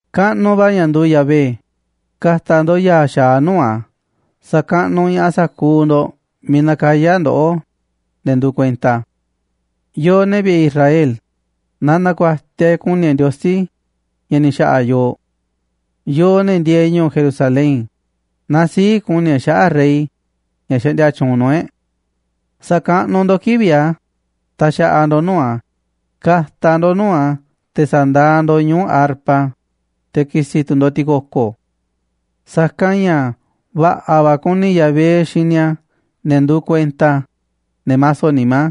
¡Kaꞌnuꞌ va̱ ña̱ nduuꞌ Yahvé! Ka̱ta̱ ndo̱ꞌ ya̱a̱ xa̱aꞌ nuu̱ꞌ a̱, sa̱kaꞌnuꞌ ña̱ꞌaꞌ sa̱kuuꞌ ndo̱ꞌ miiꞌ nakayá ndoꞌó, ne̱ nduuꞌ kuenta a̱. Yooꞌ, ne̱ vi̱ꞌe̱ Israel, na na̱ku̱a̱tiaꞌ e̱ꞌ ku̱ni̱ e̱ꞌ Ndiosí ña̱ ni̱ xa̱ꞌa̱ yooꞌ. Yooꞌ, ne̱ ndieeꞌ ñu̱u̱ Jerusalén, na sii̱ꞌ ku̱ni̱ e̱ꞌ xaꞌa̱ꞌ Rey ña̱ xaꞌndia tyuunꞌ nuu̱ꞌ e̱ꞌ. Sa̱kaꞌnuꞌ ndo̱ꞌ kivi̱ꞌ a̱ taxaꞌaꞌ ndo̱ꞌ nuu̱ꞌ a̱, ka̱ta̱ ndo̱ꞌ nuu̱ꞌ a̱, te̱ sa̱ndaaꞌ ndo̱ꞌ ñuu̱ꞌ arpa, te̱ ki̱si̱ tu̱ ndo̱ꞌ ti̱ko̱ko̱. Sa̱kanꞌ ña̱ va̱ꞌa̱ va̱ kuni Yahvé xini a̱ ne̱ nduuꞌ kuenta a̱, ne̱ maso nimá,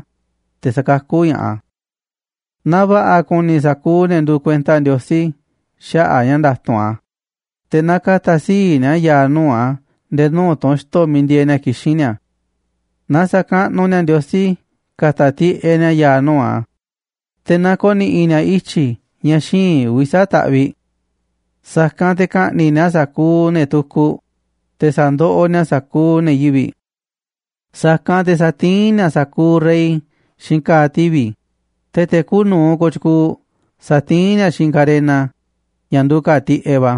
te̱ sakakú ña̱ꞌaꞌ a̱. Na va̱ꞌa̱ ku̱ni̱ sa̱kuuꞌ ne̱ nduuꞌ kuenta Ndiosí xaꞌa̱ꞌ a̱ ña̱ nda̱tu̱nꞌ a̱, te̱ na ka̱ta̱ sii̱ꞌ ni̱a̱ ya̱a̱ nuu̱ꞌ a̱ nde̱e̱ nuu̱ꞌ tunxto̱ miiꞌ ndieeꞌ ni̱a̱ kixín ni̱a̱. Na sa̱kaꞌnuꞌ ni̱a̱ Ndiosí ka̱ta̱ tiꞌeꞌ ni̱a̱ ya̱a̱ nuu̱ꞌ a̱, te̱ na ko̱ni̱ꞌi̱ ni̱a̱ ityi̱ ña̱ xíinꞌ uvi̱ sa̱aꞌ ta̱ꞌviꞌ. Sa̱kanꞌ te̱ ka̱ꞌni̱ꞌ ni̱a̱ sa̱kuuꞌ ne̱ tukuꞌ, te̱ sa̱ndoꞌoꞌ ni̱a̱ sa̱kuuꞌ ne̱ yivi̱ꞌ. Sa̱kanꞌ te̱ sa̱tiín ni̱a̱ sa̱kuuꞌ rey xiinꞌ ka̱a̱ tivi̱, te̱ te̱ kuuꞌ nu̱uꞌ kooꞌ tyukuuꞌ sa̱tiín ni̱a̱ xiinꞌ karena ña̱ nduuꞌ ka̱a̱ tiꞌeꞌ va̱.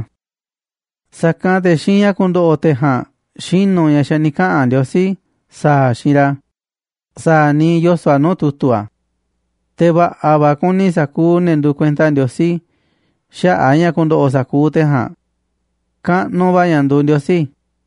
Sa̱kanꞌ te̱ xiinꞌ ña̱ ku̱ndo̱ꞌo̱ te̱ ja̱a̱nꞌ xinu̱ ña̱ xa̱ ni̱ kaꞌa̱n Ndiosí sa̱a̱ a̱ xiinꞌ ra̱, sa̱a̱ niiꞌ yoso̱ꞌ a̱ nuu̱ꞌ tu̱tu̱ a̱. Te̱ va̱ꞌa̱ va̱ ku̱ni̱ sa̱kuuꞌ ne̱ nduuꞌ kuenta Ndiosí xaꞌa̱ꞌ ña̱ ku̱ndo̱ꞌo̱ sa̱kuuꞌ te̱ ja̱a̱nꞌ. ¡Kaꞌnuꞌ va̱ ña̱ nduuꞌ Ndiosí!